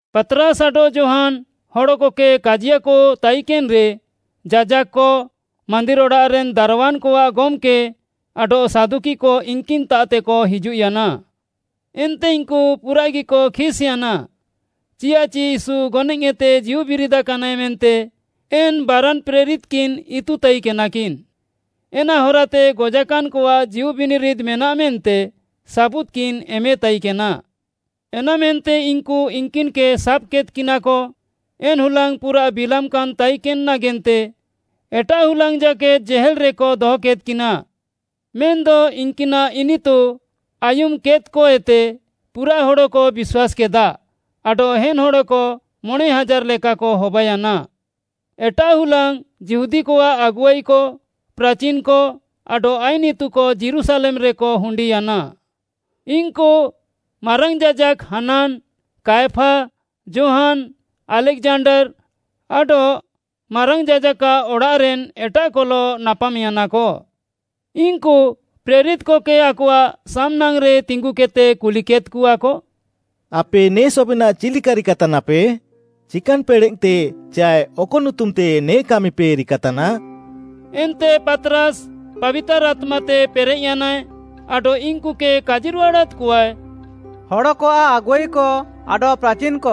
ପାତ୍‌ରାସ୍‌ ଆଡଃ ଯୋହାନ୍‌ ହଡ଼କକେ କାଜିୟାକ ତାଇକେନ୍‌ରେ ଯାଜାକ୍‌କ, ମାନ୍ଦିର୍‌ ଅଡ଼ାଃରେନ୍‌ ଦାରୱାନ୍‌କଆଃ ଗମ୍‌କେ ଆଡଃ ସାଦୁକିକ ଇନ୍‍କିନ୍‍ତାଃତେକ ହିଜୁଃୟାନା। ଏନ୍ତେ ଇନ୍‌କୁ ପୁରାଃଗିକ ଖିସ୍‌ୟାନା ଚିୟାଃଚି ୟୀଶୁ ଗନଏଃତେ ଜୀଉବିରିଦାକାନାଏ ମେନ୍ତେ ଏନ୍‌ ବାରାନ୍‌ ପ୍ରେରିତ୍‌କିନ୍‌ ଇତୁ ତାଇକେନାକିନ୍‌। ଏନା ହରାତେ ଗଜାକାନ୍‌କଆଃ ଜୀଉବିନିରିଦ୍‌ ମେନାଃ ମେନ୍ତେ ସାବୁଦ୍‌କିନ୍‌ ଏମେତାଇକେନା। ଏନାମେନ୍ତେ ଇନ୍‌କୁ ଇନ୍‌କିନ୍‌କେ ସାବ୍‍କେଦ୍‍କିନାକ। ଏନ୍‌ ହୁଲାଙ୍ଗ୍‌ ପୁରାଃ ବିଲାମ୍‌କାନ୍‌ ତାଇକେନ୍‌ ନାଗେନ୍ତେ ଏଟାଃ ହୁଲାଙ୍ଗ୍‌ ଜାକେଦ୍‌ ଜେହେଲ୍‌ରେକ ଦହକେଦ୍‍କିନା। ମେନ୍‌ଦ ଇନ୍‌କିନାଃ ଇନିତୁ ଆୟୁମ୍‍କେଦ୍‌କଏତେ ପୁରାଃ ହଡ଼କ ବିଶ୍ୱାସ୍‌କେଦା ଆଡଃ ଏନ୍‌ ହଡ଼କ ମଣେଁ ହାଜାର୍‌ ଲେକାକ ହବାୟାନା। ଏଟାଃ ହୁଲାଙ୍ଗ୍‌ ଯିହୁଦୀକଆଃ ଆଗୁଆଇକ, ପ୍ରାଚିନ୍‌କ ଆଡଃ ଆଇନ୍‌ ଇତୁକ ଯୀରୁଶାଲେମ୍‌ରେକ ହୁଣ୍ଡିୟାନା। ଇନ୍‌କୁ ମାରାଙ୍ଗ୍‌ ଯାଜାକ୍‌ ହାନାନ୍‌, କାୟଫା, ଯୋହାନ୍‌, ଆଲେକ୍‌ଜାଣ୍ଡାର୍‌ ଆଡଃ ମାରାଙ୍ଗ୍‌ ଯାଜାକ୍‌ଆଃ ଅଡ଼ାଃରେନ୍‌ ଏଟାଃକଲଃ ନାପାମ୍‌ୟାନାକ। ଇନ୍‌କୁ ପ୍ରେରିତ୍‌କକେ ଆକଆଃ ସାମ୍‌ନାଙ୍ଗ୍‌ରେ ତିଙ୍ଗୁକେଦ୍‌ତେ କୁଲିକେଦ୍‌କଆକ, “ଆପେ ନେ ସବେନାଃ ଚିଲ୍‌କା ରିକାତାନାପେ? ଚିକାନ୍‌ ପେଡ଼େଃତେ ଚାଏ ଅକ ନୁତୁମ୍‌ତେ ନେ କାମିପେ ରିକାତାନା?” ଏନ୍ତେ ପାତ୍‌ରାସ୍‌ ପାବିତାର୍‌ ଆତ୍ମାତେ ପେରେଃୟାନାଏ ଆଡଃ ଇନ୍‌କୁକେ କାଜିରୁହାଡ଼ାଦ୍‌କଆଏ, “ହଡ଼କଆଃ ଆଗୁଆଇକ ଆଡଃ ପ୍ରାଚିନ୍‌କ,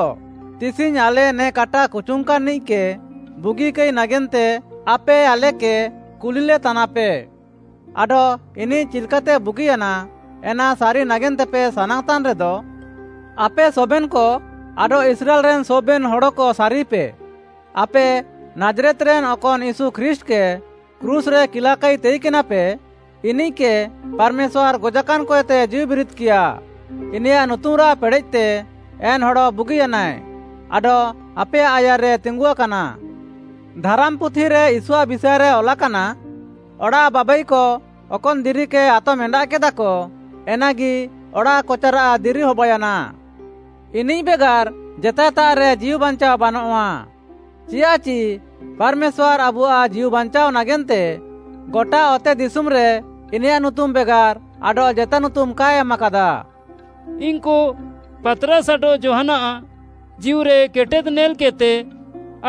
ତିସିଙ୍ଗ୍‌ ଆଲେ ନେ କାଟା କୁଚୁଙ୍ଗ୍‌କାନ୍‌ନିଃକେ ବୁଗିକାଇ ନାଗେନ୍ତେ ଆପେ ଆଲେକେ କୁଲିଲେତାନାପେ ଆଡଃ ଇନିଃ ଚିଲ୍‌କାତେ ବୁଗିୟାନା, ଏନା ସାରି ନାଗେନ୍ତେପେ ସାନାଙ୍ଗ୍‌ତାନ୍‌ରେଦ, ଆପେ ସବେନ୍‌କ ଆଡଃ ଇସ୍ରାଏଲ୍‌ରେନ୍‌ ସବେନ୍‌ ହଡ଼କ ସାରିପେ, ଆପେ ନାଜ୍‌ରେତ୍‌ରେନ୍‌ ଅକନ୍‌ ୟୀଶୁ ଖ୍ରୀଷ୍ଟ୍‌କେ କ୍ରୁଶ୍‌ରେ କିଲାକାଇ ତାଇକେନାପେ, ଇନିଃକେ ପାର୍‌ମେଶ୍ୱାର୍‌ ଗଜାକାନ୍‌କଏତେ ଜୀଉବିରିଦ୍‌କିୟା, ଇନିୟାଃ ନୁତୁମ୍‌ରାଃ ପେଡ଼େଃତେ ଏନ୍‌ ହଡ଼ ବୁଗିୟାନାଏ ଆଡଃ ଆପେୟାଃ ଆୟାର୍‌ରେ ତିଙ୍ଗୁଆକାନା। ଧାରାମ୍‌ପୁଥିରେ ୟୀଶୁଆଃ ବିଷାଏରେ ଅଲାକାନା, “‘ଅଡ଼ାଃ ବାବାଇକ ଅକନ୍‌ ଦିରିକେ ଆତମ୍‌ଏଣ୍ଡାଃକେଦାକ ଏନାଗି ଅଡ଼ାଃକଚାରାଃ ଦିରି ହବାୟାନା।’ ଇନିଃ ବେଗାର୍‌ ଜେତାଏତାଃରେ ଜୀଉବାଞ୍ଚାଅ ବାନଃଆ, ଚିୟାଃଚି ପାର୍‌ମେଶ୍ୱାର୍‌ ଆବୁଆଃ ଜୀଉବାଞ୍ଚାଅ ନାଗେନ୍ତେ ଗଟା ଅତେଦିଶୁମ୍‌ରେ ଇନିୟାଃ ନୁତୁମ୍‌ ବେଗାର୍‌ ଆଡଃ ଜେତା ନୁତୁମ୍‌ କାଏ ଏମାକାଦା।” ଇନ୍‌କୁ ପାତ୍‌ରାସ୍‌ ଆଡଃ ଯୋହାନ୍‌ଆଃ ଜୀଉରେକେଟେଦ୍‌ ନେଲ୍‍କେଦ୍‌ତେ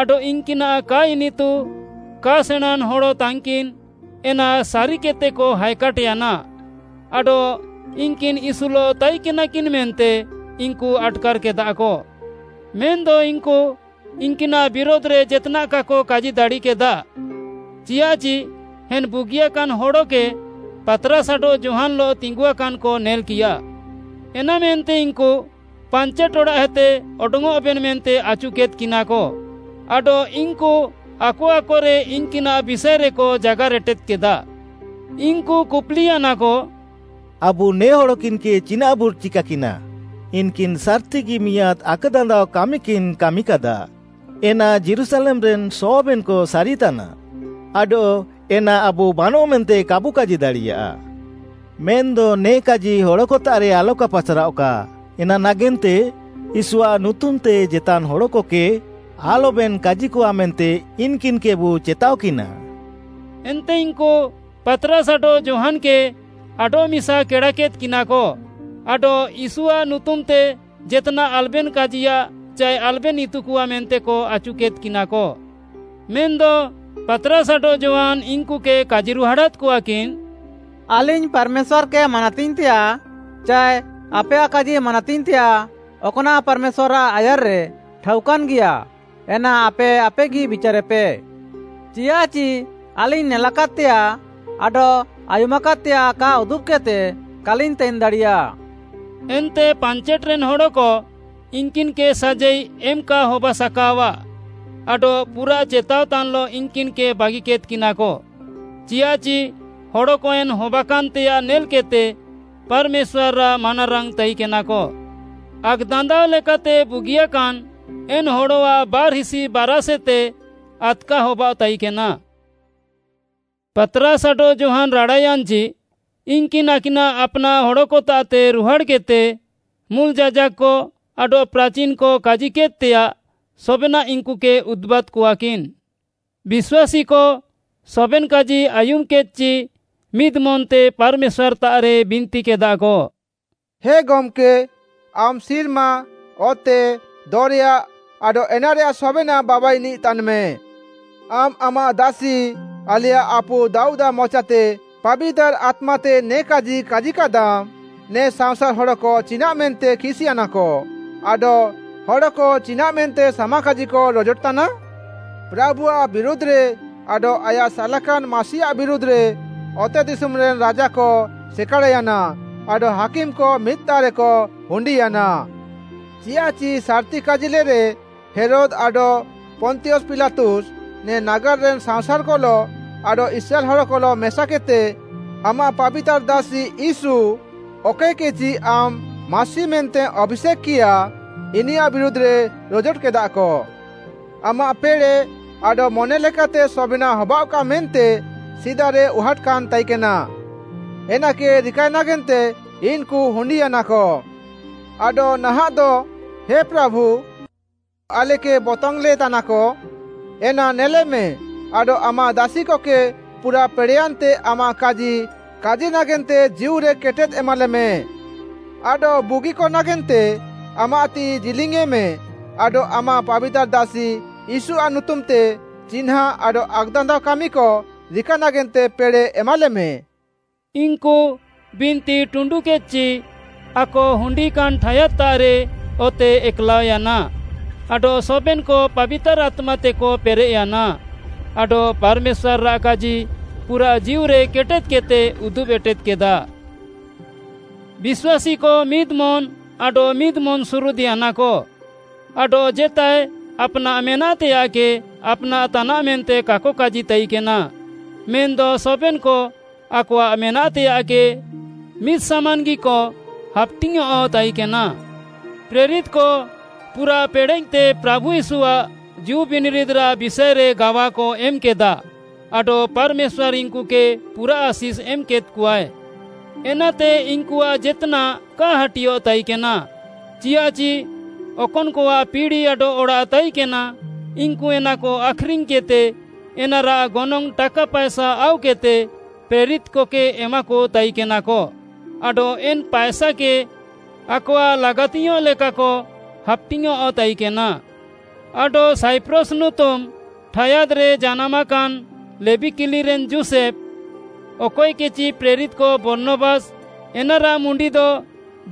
ଆଡଃ ଇନ୍‌କିନାଃ କା ଇନିତୁ, କା ସେଣାଁଁନ୍‌ ହଡ଼କିନ୍ ତାନ୍‍କିନ୍‌ ଏନା ସାରିକେଦ୍‌ତେକ ହାଏକାଟ୍‍ୟାନା ଆଡଃ ଇନ୍‌କିନ୍‌ ୟୀଶୁଲଃ ତାଇକେନାକିନ୍‌ ମେନ୍ତେ ଇନ୍‌କୁ ଆଟ୍‌କାର୍‌କେଦାକ। ମେନ୍‌ଦ ଇନ୍‌କୁ ଇନ୍‌କିନାଃ ବିରୁଧ୍‌ରେ ଜେତ୍‌ନାଃ କାକ କାଜିଦାଡ଼ିକେଦା ଚିୟାଃଚି ଏନ୍‌ ବୁଗିଆକାନ୍ ହଡ଼କେ ପାତ୍‌ରାସ୍‌ ଆଡଃ ଯୋହାନ୍‌ଲଃ ତିଙ୍ଗୁଆକାନ୍‌କ ନେଲ୍‌କିୟା। ଏନାମେନ୍ତେ ଇନ୍‌କୁ ପାଞ୍ଚେଟ୍‌ ଅଡ଼ାଃଏତେ ଅଡଙ୍ଗ୍‌ଅଃବେନ୍‌ ମେନ୍ତେ ଆଚୁକେଦ୍‌କିନାକ ଆଡଃ ଇନ୍‌କୁ ଆକ ଆକରେ ଇନ୍‌କିନାଃ ବିଷାଏରେକ ଜାଗାର୍‍ ଏଟେଦ୍‌କେଦା। ଇନ୍‌କୁ କୁପ୍‌ଲିୟାନାକ, “ଆବୁ ନେ ହଡ଼କିନ୍‌କେ ଚିନାଃବୁ ଚିକାକିନା? ଇନ୍‌କିନ୍‌ ସାର୍‍ତିଗି ମିଆଁଦ୍‌ ଆକ୍‌ଦାନ୍ଦାଅ କାମିକିନ୍ କାମିକାଦା ଏନା ଯୀରୁଶାଲେମ୍‌ରେନ୍‌ ସବେନ୍‌କ ସାରିତାନା ଆଡଃ ଏନା ଆବୁ ବାନଃ ମେନ୍ତେ କାବୁ କାଜି ଦାଡ଼ିୟା। ମେନ୍‌ଦ ନେ କାଜି ହଡ଼କତାଃରେ ଆଲକା ପାସ୍‍ରାଅଃକା, ଏନା ନାଗେନ୍ତେ ୟୀଶୁଆଃ ନୁତୁମ୍‌ତେ ଜେତା ହଡ଼କକେ ଆଲବେନ୍‌ କାଜିକଆ ମେନ୍ତେ ଇନ୍‍କିନ୍‌କେବୁ ଚେତାଅକିନା।” ଏନ୍ତେ ଇନ୍‌କୁ ପାତ୍‌ରାସ୍‌ ଆଡଃ ଯୋହାନ୍‌କେ ଆଡଃମିସା କେଡ଼ାକେଦ୍‍କିନାକ ଆଡଃ ୟୀଶୁଆଃ ନୁତୁମ୍‌ତେ ଜେତ୍‌ନାଃ ଆଲବେନ୍‌ କାଜିୟାଃ ଚାଏ ଆଲବେନ୍‌ ଇତୁକଆ ମେନ୍ତେକ ଆଚୁକେଦ୍‍କିନାକ। ମେନ୍‌ଦ ପାତ୍‌ରାସ୍‌ ଆଡଃ ଯୋହାନ୍‌ ଇନ୍‌କୁକେ କାଜିରୁହାଡ଼ାଦ୍‍କଆକିନ୍, “ଆଲିଙ୍ଗ୍‌ ପାର୍‌ମେଶ୍ୱାର୍‌କେ ମାନାତିଙ୍ଗ୍‌ତେୟାଃ ଚାଏ ଆପେୟାଃ କାଜି ମାନାତିଙ୍ଗ୍‌ତେୟାଃ ଅକ୍‌ନାଃ ପାର୍‌ମେଶ୍ୱାର୍‌ଆଃ ଆୟାର୍‌ରେ ଠାଉକାନ୍‌ଗିୟା ଏନା ଆପେ ଆପେଗି ବିଚାରେପେ। ଚିୟାଃଚି ଆଲିଙ୍ଗ୍‌ ନେଲାକାଦ୍‌ତେୟାଃ ଆଡଃ ଆୟୁମାକାଦ୍‌ତେୟାଃ କା ଉଦୁବ୍‍କେଦ୍‍ତେ କାଲିଙ୍ଗ୍‌ ତାଇନ୍‍ଦାଡ଼ିୟା।” ଏନ୍ତେ ପାଞ୍ଚେଟ୍‌ରେନ୍‌ ହଡ଼କ ଇନ୍‌କିନ୍‌କେ ସାଜାଇ ଏମ୍‌ କା ହବାସାକାଅଆଃ, ଆଡଃ ପୁରାଃ ଚେତାଅତାନ୍‍ଲଃ ଇନ୍‌କିନ୍‌କେ ବାଗିକେଦ୍‍କିନାକ, ଚିୟାଃଚି ହଡ଼କ ଏନ୍‌ ହବାକାନ୍‌ତେୟାଃ ନେଲ୍‌କେଦ୍‌ତେ ପାର୍‌ମେଶ୍ୱାର୍‌ଆଃ ମାନାରାଙ୍ଗ୍‌ ତାଇକେନାକ। ଆକ୍‌ଦାନ୍ଦାଅ ଲେକାତେ ବୁଗିଆକାନ୍ ଏନ୍‌ ହଡ଼ଆଃ ବାର୍‌ହିସି ବାରାଷ୍‌ଏତେ ଆଦ୍‌କା ହବାଅଃତାଇକେନା। ପାତ୍‌ରାସ୍‌ ଆଡଃ ଯୋହାନ୍‌ ରାଡ଼ାୟାନ୍‌ଚି, ଇନ୍‌କିନ୍‌ ଆକିନାଃ ଆପ୍‌ନାଃ ହଡ଼କତାଃତେ ରୁହାଡ଼୍‌କେଦ୍‌ତେ ମୁଲ୍‌ ଯାଜାକ୍‌କ ଆଡଃ ପ୍ରାଚିନ୍‌କ କାଜିକେଦ୍‌ତେୟାଃ ସବେନାଃ ଇନ୍‌କୁକେ ଉଦୁବାଦ୍‌କଆକିନ୍‌। ବିଶ୍ୱାସୀକ ସବେନ୍‍ କାଜି ଆୟୁମ୍‌କେଦ୍‌ଚି ମିଦ୍‌ ମନ୍‌ତେ ପାର୍‌ମେଶ୍ୱାର୍‌ତାଃରେ ବିନ୍ତିକେଦାକ; “ହେ ଗମ୍‌କେ, ଆମ୍‌ ସିର୍ମା, ଅତେ, ଦରେୟା ଆଡଃ ଏନାରେୟାଃ ସବେନାଃ ବାବାଇନିଃ ତାନ୍‌ମେ! ଆମ୍‌ ଆମାଃ ଦାସି, ଆଲେୟାଃ ଆପୁ ଦାଉଦ୍‌ଆଃ ମଚାତେ ପାବିତାର୍‌ ଆତ୍ମାତେ ନେ କାଜି କାଜିକାଦାମ୍‌, “‘ନେ ସାଅଁସାର୍‌ ହଡ଼କ ଚିନାଃମେନ୍ତେ ଖିସ୍‍ୟାନାକ; ଆଡଃ ହଡ଼କ ଚିନାଃମେନ୍ତେ ସାମାକାଜିକ ରୋଜୋଟତାନା? ପ୍ରାଭୁଆଃ ବିରୁଧ୍‌ରେ ଆଡଃ ଆୟାଃ ସାଲାକାନ୍‌ ମାସିଆଃ ବିରୁଧ୍‌ରେ ଅତେଦିଶୁମ୍‌ରେନ୍‌ ରାଜାକ ସେକାଡ଼୍‌ୟାନା ଆଡଃ ହାକିମ୍‌କ ମିଦ୍‍ତାଃରେକ ହୁଣ୍ଡିୟାନା।’ ଚିୟାଃଚି ସାର୍‌ତି କାଜିଲେରେ ହେରୋଦ୍‌ ଆଡଃ ପନ୍ତିୟସ୍‌ ପିଲାତୁସ୍‌ ନେ ନାଗାର୍‌ରେ ସାଅଁସାର୍‌କଲଃ ଆଡଃ ଇସ୍ରାଏଲ୍‌ ହଡ଼କଲଃ ମେସାକେଦ୍‌ତେ ଆମାଃ ପାବିତାର୍‌ ଦାସି ୟୀଶୁ, ଅକଏକେଚି ଆମ୍‌ ମାସି ମେନ୍ତେମ୍‌ ଆଭିଷେକ୍‌କିୟା, ଇନିୟାଃ ବିରୁଧ୍‌ରେ ରୋଜୋଟକେଦାକ। ଆମାଃ ପେଡ଼େଃ ଆଡଃ ମନେଲେକାତେ ସବେନାଃ ହବାଅଃକା ମେନ୍ତେ ସିଦାରେ ଉହାଟ୍‌କାନ୍‌ ତାଇକେନା, ଏନାକେ ରିକାଏ ନାଗେନ୍ତେ ଇନ୍‌କୁ ହୁଣ୍ଡିୟାନାକ। ଆଡଃ ନାହାଁଃଦ, ହେ ପ୍ରାଭୁ, ଇନ୍‌କୁ ଆଲେକେ ବତଙ୍ଗ୍‌ଲେତାନାକ ଏନା ନେଲେମେ ଆଡଃ ଆମାଃ ଦାସିକକେ ପୁରାଃ ପେଡ଼େୟାନ୍‌ତେ ଆମାଃ କାଜି କାଜି ନାଗେନ୍ତେ ଜୀଉରେକେଟେଦ୍‌ ଏମାଲେମେ। ଆଡଃ ବୁଗିକ ନାଗେନ୍ତେ ଆମାଃ ତିଃଇ ଜିଲିଙ୍ଗ୍‌ୟେଁମେ ଆଡଃ ଆମାଃ ପାବିତାର୍‌ ଦାସି ୟୀଶୁଆଃ ନୁତୁମ୍‌ତେ ଚିହ୍ନାଁ ଆଡଃ ଆକ୍‌ଦାନ୍ଦାଅ କାମିକ ରିକା ନାଗେନ୍ତେ ପେଡ଼େଃ ଏମାଲେମେ।” ଇନ୍‌କୁ ବିନ୍ତି ଟୁଣ୍ଡୁକେଦ୍‌ଚି ଆକ ହୁଣ୍ଡିକାନ୍ ଠାୟାଦ୍‌ତାଃରେ ଅତେ ଏକ୍‌ଲାଅୟାନା ଆଡଃ ସବେନ୍‌କ ପାବିତାର୍‌ ଆତ୍ମାତେକ ପେରେଃୟାନା ଆଡଃ ପାର୍‌ମେଶ୍ୱାର୍‌ଆଃ କାଜି ପୁରାଃ ଜୀଉରେ କେଟେଦ୍‌କେଦ୍‌ତେ ଉଦୁବ୍‍ ଏଟେଦ୍‌କେଦା। ବିଶ୍ୱାସୀକ ମିଦ୍‌ ମନ୍‌ ଆଡଃ ମିଦ୍‌ ମନ୍‌ସୁରୁଦ୍‌ୟାନାକ। ଆଡଃ ଜେତାଏ ଆପ୍‌ନାଃ ମେନାଃତେୟାଃକେ ଆପ୍‍ନାଃ ତାନାଃ ମେନ୍ତେ କାକ କାଜି ତାଇକେନା, ମେନ୍‌ଦ ସବେନ୍‌କ ଆକଆଃ ମେନାଃତେୟାଃକେ ମିଦ୍‌ସାମାନ୍‌ଗିକ ହାପ୍‌ଟିଙ୍ଗ୍‌ୟଁଃ ତାଇକେନା। ପ୍ରେରିତ୍‌କ ପୁରାଃ ପେଡ଼େଃତେ ପ୍ରାଭୁ ୟୀଶୁଆଃ ଜୀଉବିନିରିଦ୍‌ରାଃ ବିଷାଏରେ ଗାୱାକ ଏମ୍‌କେଦା ଆଡଃ ପାର୍‌ମେଶ୍ୱାର୍‌ ଇନ୍‌କୁକେ ପୁରାଃ ଆଶିଷ୍‌ ଏମ୍‌କେଦ୍‍କଆଏ। ଏନାତେ ଇନ୍‌କୁଆଃ ଜେତ୍‌ନାଃ କା ହାଟିଅଃ ତାଇକେନା, ଚିୟାଃଚି ଅକନ୍‌କଆଃ ପିଡ଼ି ଆଡଃ ଅଡ଼ାଃ ତାଇକେନା, ଇନ୍‌କୁ ଏନାକ ଆଖ୍‌ରିଙ୍ଗ୍‌କେଦ୍‌ତେ ଏନାରାଃ ଗନଙ୍ଗ୍‌ ଟାକା ପାଏସା ଆଉକେଦ୍‌ତେ ପ୍ରେରିତ୍‌କକେ ଏମାକ ତାଇକେନାକ ଆଡଃ ଏନ୍‌ ପାଏସାକେ ଆକଆଃ ଲାଗାତିୟଃଁ ଲେକାକ ହାପ୍‌ଟିଙ୍ଗ୍‌ୟଁଃ ତାଇକେନା। ଆଡଃ ସାଇପ୍ରସ୍‌ ନୁତୁମ୍‌ ଠାୟାଦ୍‌ରେ ଜାନାମାକାନ୍‌ ଲେବୀ କିଲିରେନ୍‌ ଯୋଷେଫ୍‌, ଅକଏକେଚି ପ୍ରେରିତ୍‌କ ବର୍ଣ୍ଣବାସ୍‌, ଏନାରାଃ ମୁଣ୍ଡିଦ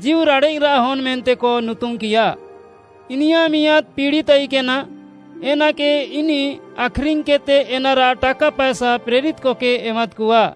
“ଜୀଉରାଡ଼େଃରାଃ ହନ୍‌” ମେନ୍ତେକ ନୁତୁମ୍‌କିୟା। ଇନିୟାଃ ମିଆଁଦ୍‌ ପିଡ଼ି ତାଇକେନା, ଏନାକେ ଇନିଃ ଆଖ୍‌ରିଙ୍ଗ୍‌କେଦ୍‌ତେ ଏନାରାଃ ଟାକା ପାଏସା ପ୍ରେରିତ୍‌କକେ ଏମାଦ୍‌କଆ।